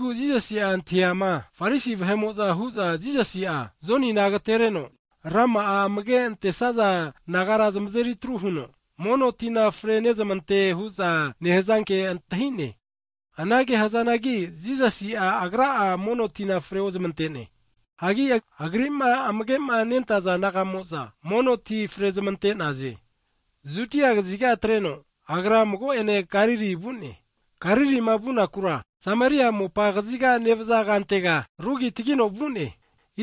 Jisasi'a antahiama Farisi vahe'mo'za hu'za Jisasi'a, Jonina agatereno rama'a amage antesaza disaipol nagara zamazeritru huno, mono tina frenezmante hu'za nehazanke antahi'ne. (Anage hzanagi Jisas Agra'a mono tina freozmante'ne. Hagi Agri'ma amage nentaza disaipol nagamo'za mono tina fre zamante'naze.) Judia kaziga atreno Agra mago'ene Galili vu'ne. Galilima vunakura Samaria mopa kazigati nevza kantega rugitgino vu'ne.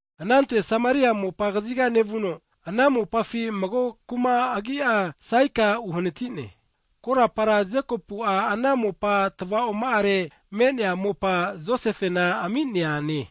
Anante Samaria mopa kaziga nevuno, ana mopafi mago kuma agi'a Saikar nehazare uhanati'ne. Korapara Jekopu'a ana mopa tva'oma'are me'nea mopa, Josefena ami'neane.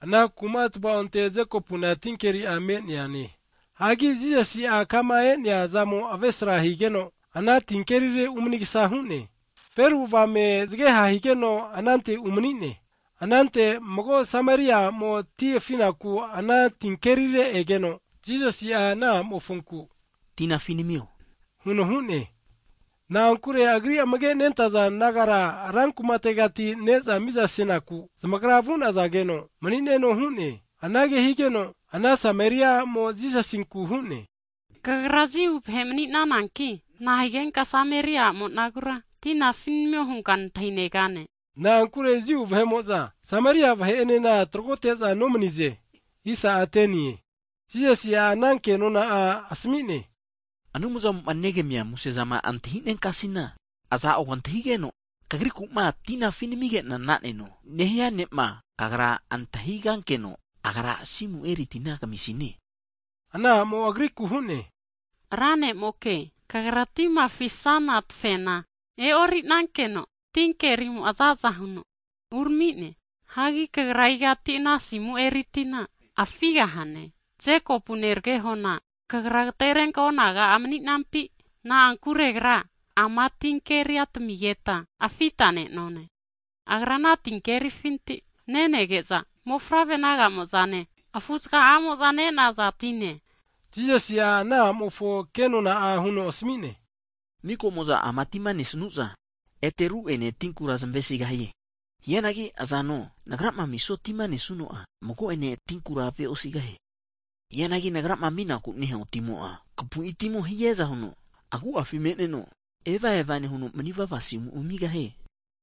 Ana kuma tva'onte Jekopuna tinkeri'a me'ne. Hagi Jisasi'a kama e'nea zamo avesra higeno ana tinkerire umanigsa hu'ne. Feru avame zgeha higeno anante umani'ne. Anante mago Samaria a'mo ti afinaku ana tinkerire egeno, Jisasi ana a'mofonku, Tina afi namio huno hune. Na'ankure Agri amage nentaza disaipol nagara ran kumategati ne'za mizasenaku zamagra vu'nazageno mani'neno hu'ne. Anage higeno ana Samaria a'mo Jisasinku huno Kagra Jiu ne' mani'nananki nahigenka Samaria a' monagura, tina afi namio hunka nantahi'negane? (Na'ankure Jiu vahe'mo'za Samaria vahe'enena tragote'za nomnize.) Jisasi'a ana ke nona'a asmi'ne, Anumzamo negamia musezama antahi'nenkasina, iza'o kantahigeno kagriku'ma, tina afi namige'na na'neno nehia ne'ma kagra antahigankeno, Agra asimu eri tina kamisine. Ana a'mo Agriku huno Ra ne'moke Kagra tima afisana tafena e'ori'nankeno tinkerimo'a zaza huno urami'ne. Hagi Kagra igati ana asimu eri tina afigahane? Jekopu neragehona Kagra agterenka onaga'a mani'nampi? Na'ankure agra ama tinkeria tamine, agra ana tinkerifinti nenege'za, mofavre naga'amozane afu'zga'amoza ne'naza tine. Jisasi'a ana a'mofo ke nona'a huno asmi'ne, Maka'mo'za ama tima nesnuza ete ru'ene tinkura zamesigahie. Hianagi izano Nagrama amisua tima nesuno'a, mago'ene tinkura ave'osigahie. Hianagi Nagrama aminaku nehua timo'a, kampu'i timo hiaza huno agu'afi me'neno, evava nehuno manivava asimu amigahie.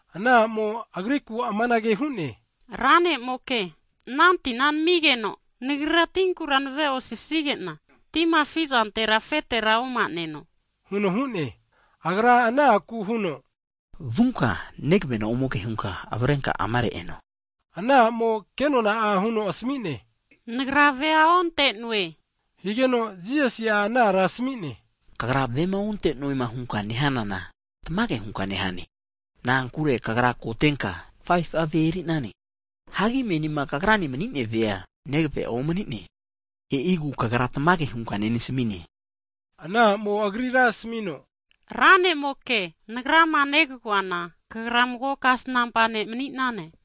Ana a'mo Agriku amanage hu'ne, Ra nemoka, ana tina namigeno, nagrira tinkura nave'osisige'na tima afi'zantera afetera oma'neno, huno hu'ne. Agra ana aku huno, Vunka, negvena ome ke hunka avrenka amare eno. Ana a'mo kenona'a huno asmi'ne, Nagra ve onte'noe higeno, Jisasi ana ara asmine, kagra vema onte'noe hunkama nehanana tamage hunka nehane, na'ankure kagra kotenka 5fu'a ve eri'nane, hagi menima kagrane mani'nea vea negve'a omni'ne. E'igu kagra tamage hunka nenasmine. Ana a'mo Agrira asmino, Ra nemoke, nagrama negagoana Kagra mago kasnampa ne' mani'nane.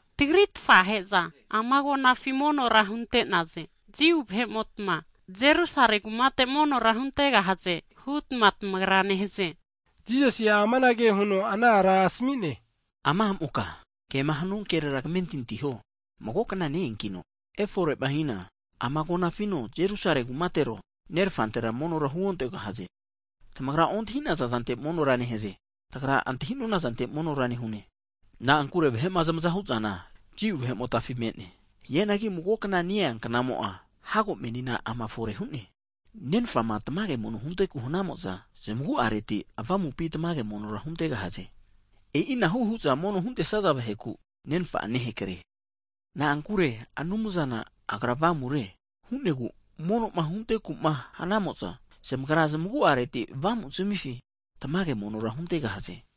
Tagri tfahe'za ama agonafi monora hunte'naze. Jiu vahe'motma Jerusale kumateke monora huntegahaze hutma tamagra nehaze. Jisasi'a amanage huno ana ara asmi'ne, Ama a'moka, kema hanua kerera kmentinti huo, mago kna ne'eankino efore'mahina, ama agonafino, Jerusale kumatero tamagra Nerfantera monora huontegahaze. Tamagra ontahi'naza zante monora nehaze, tagra antahi'nona zante monora nehune. Na'ankure vahe'ma zamaguvazizana Jiu vahe'motafi me'ne. Hianagi mago kna ne-ea knamo'a hago menina ama fore hu'ne. Nenfama tamage mono hunteku hanamo'za, avamupi tamage avu'avateti monora huntegahaze. E'inahu hu'za mono'ma huntesaza vaheku Nenfa'a nehakre. Na'ankure Anumzana Agra Avamure, hu'negu mono'ma hunteku hanamo'za, zamagra zamagu'areti avamuzmifi tamage monora huntegahaze.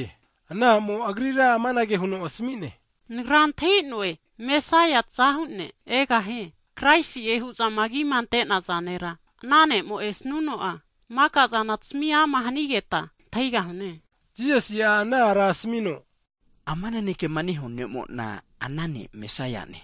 Ana a'mo Agrira amanage huno asmi'ne, nagra antahi'noe Mesaia'a (tazahu ne') egahie, (Kraisi'e hu'zama agima ante'naza nera), ana ne'ma esnuno'a, maka'zana tasmi ama hanigeta antahi'gahune. Jisasi'a ana ara asmino, ama nanekema nehua ne'mona ana ne' Mesaia'ne.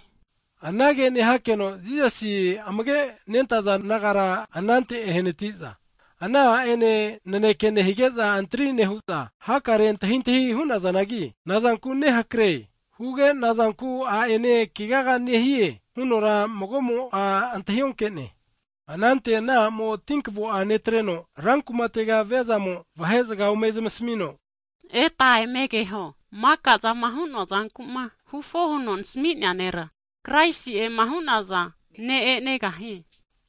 Anage nehakeno Jisasi amage' nentaza disaipol nagara anante enehanatiza, ana a'ene naneke nehige'za antri nehu'za hakare antahintahi hu'nazanagi, nazanku nehakre huge, nazanku a'ene kegaga nehie? Hunora mago'mo'a antahi onke'ne. Anante ana a'mo tinkvo'a netreno, rankumatega viazamo vene'ne zga ome zamasmino, Eta eme keho, maka'zama hu'noa zanku'ma huama huno nasmi'nea nera, Kraisi'ema hu'naza ne' e'negahie?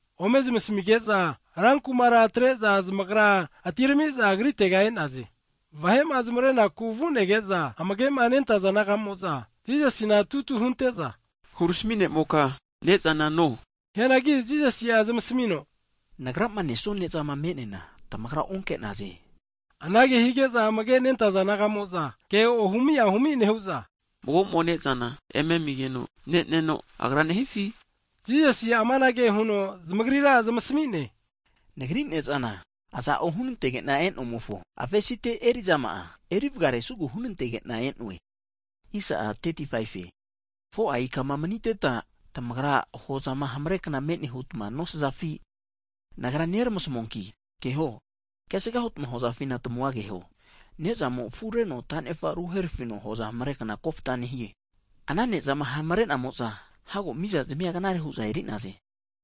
Ome zamasmige'za, rankumara atre'za zamagra atirami'za Agritega e'naze. Vahe'ma zamarenaku vu'nege'za amage nentaza disaipol nagamo'za Jisasina tutu hunte'za, hurami ne'moka (Rabbai), ne'zana no hu'naze. Hianagi Jisasi'a zamasmi'no, Nagrama nesua ne'zama me'neana tamagra onke'naze, huno zamasmi'ne. Anage hige'za amage nentaza disaipol nagamo'za, ke ohumi ahumi nehu'za, zamagra hu'za mago'mo ne'zana eme amigeno ne'neno Agra nehifi? Jisasi amanage huno zamagrira zamasmi'ne, Nagri ne'zana aza'o hunantege'na e'nomofo avesite eri'zama'a eri vgare snugu hunantege'na e'noe. 4'a ika maniteta tamagra hozama hamre kna me'ne huta nosafi? Nagra neramasmuanki keho, kesga hutma hozafina tmua keho, ne'zamo afureno ta'nefa ruherafino hoza hamre kna kofta nehie. Ana ne'zama hamre'namo'za hago mizazamia knare hu'za eri'naze.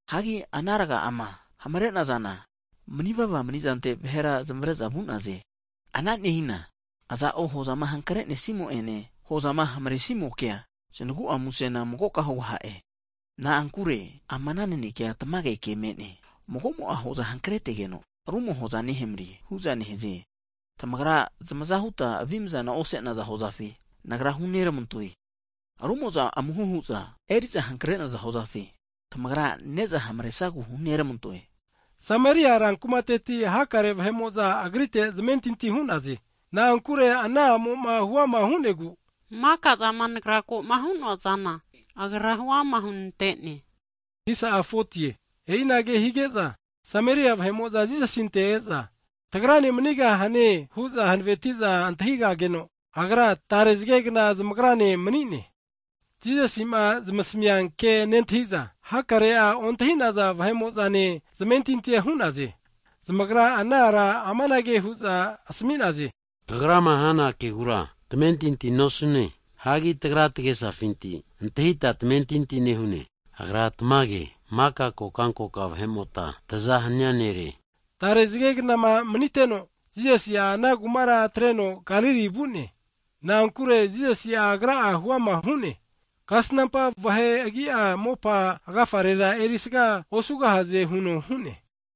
Hagi ana rga'ama hamre'nazana manivava mani'zante vahera zamare'za vu'naze, ana nehina aza'o hozama hankresnimo'ene, hozama hamresi'mokea, znagu'a musena magoka hugaha'e. Na'ankure ama ana nanekea tamage ke me'ne. Mago'mo hoza hankretegeno, rumo hoza nehamre hu'za nehaze. Tamagra zamaza hutma avimzana ose'naza hozafi Nagra huneramantoe, rumo'za amuho hu'za eri'za hankre'naza hozafi, tamagra ne'za hamre'sagu huneramantoe. Samaria rankumateti hakare vahe'mo'za Agrite zamentinti hu'naze. Na'ankure ana a'moma huama hu'negu maka'zama nagra ko'ma hu'noa zana, Agra huama hunante'ne. E'inage hige'za, Samaria vahe'mo'za Jisasinte e'za, tagrane manigahane hu'za hanaveti'za antahigageno, Agra tare zgegna zamagrane mani'ne. Jisasi'ma zamasmia ke nentahi'za, hakare'a ontahi'naza vahe'mo'zane zamentinti hu'naze. Zamagra ana ara amanage hu'za asmi'naze, kagrama hana kegukera tamentinti nosune, hagi tagra tagesafinti antahita tamentinti nehune. Agra tamage maka kokankoka vahemota tzahu nere. Tare zge knama maniteno, Jisasi'a ana kumara atreno Galili vu'ne. Na'ankure Jisasi'a Agra'a huama huno, Kasnampa (profet) vahe agi'a mopa agafa'arera erisaga osugahaze huno hu'ne.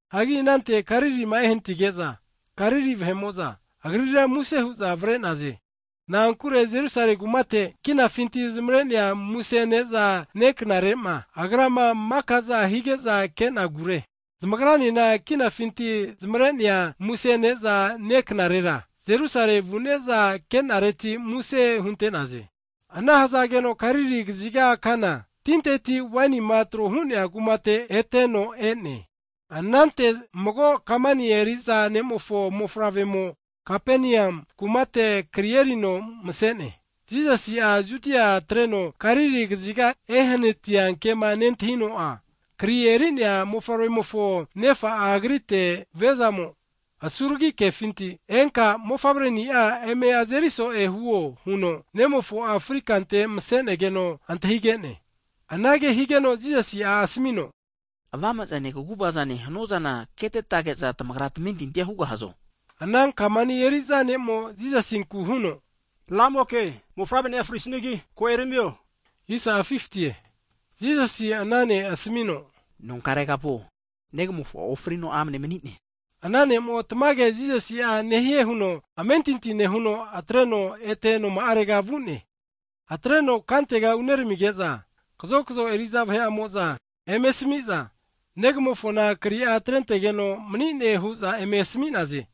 Hagi anante Galilima ehanatige'za, Galili vahe'mo'za Agrira muse hu'za avare'naze, na'ankure Jerusale kumate kinafinti zamare'nea muse ne'za ne'knarema (pasova) Agrama maka'za hige'za ke'nagure. Zamagranena kinafinti zamare'nea muse ne'za ne knarera (pasova) Jerusale vu'neza ke'nareti muse hunte'naze. Ana hzageno Kana Galili kaziga, tinteti waini'ma trohu'nea kumate eteno e'ne. Anante mago kamani eri'za ne'mofo mofavre'mo Kapenium kumate kri erino mse'ne. Jisasi'a Judia atreno Galili kaziga ehanatia kema nentahino'a, kri eri'nea mofavre'mofo nefa'a Agrite viazamo asuragi kefinti, enka mofavre ni'a eme azeri so'e huo huno nemofo'a fri'kante mse'negeno antahige'ne. Anage higeno Jisasi'a asmino, avame'zane kaguvaza hanuazana ketetage'za, tamagra tamentintia hugahazo! Ana kamani eri'za ne'mo Jisasinku huno, Ramoke mofavreni'a frisanigi ko eramio. Jisasi ana ne' asmino, nonkarega vuo, negamofo'a ofrino amne mani'ne. Ana ne'mo tamage Jisasi'a nehie huno amentinti nehuno atreno ete noma'arega vu'ne. Atreno kantega uneramige'za, kazokzo eri'za vahe'amo'za eme asmi'za, negamofona kri'a atrentegeno mani'ne hu'za eme asmi'naze.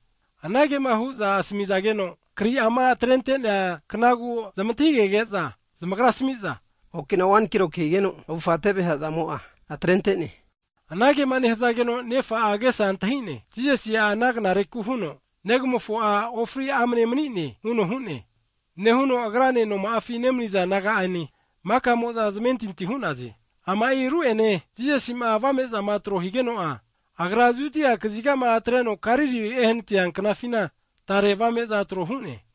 Anagema hu'za asmizageno kri'ama atrente'nea knagu zamantahigege'za zamagra asmi'za, okina wan kiloki higeno avufa teve hazamo'a atrente'ne. Anagema nehzageno nefa'a agesa antahi'ne, Jisasi'a ana knareku huno, Negamofo'a ofri amne mani'ne huno hu'ne, nehuno agrane noma'afi nemniza naga'ane, maka'moza zamentinti hu'naze. Ama'i ru'ene Jisasi'ma avame'za tro higeno'a, Agra Judia kazigama atreno Galili ehanatia knafina tare avame'za tro hu'ne.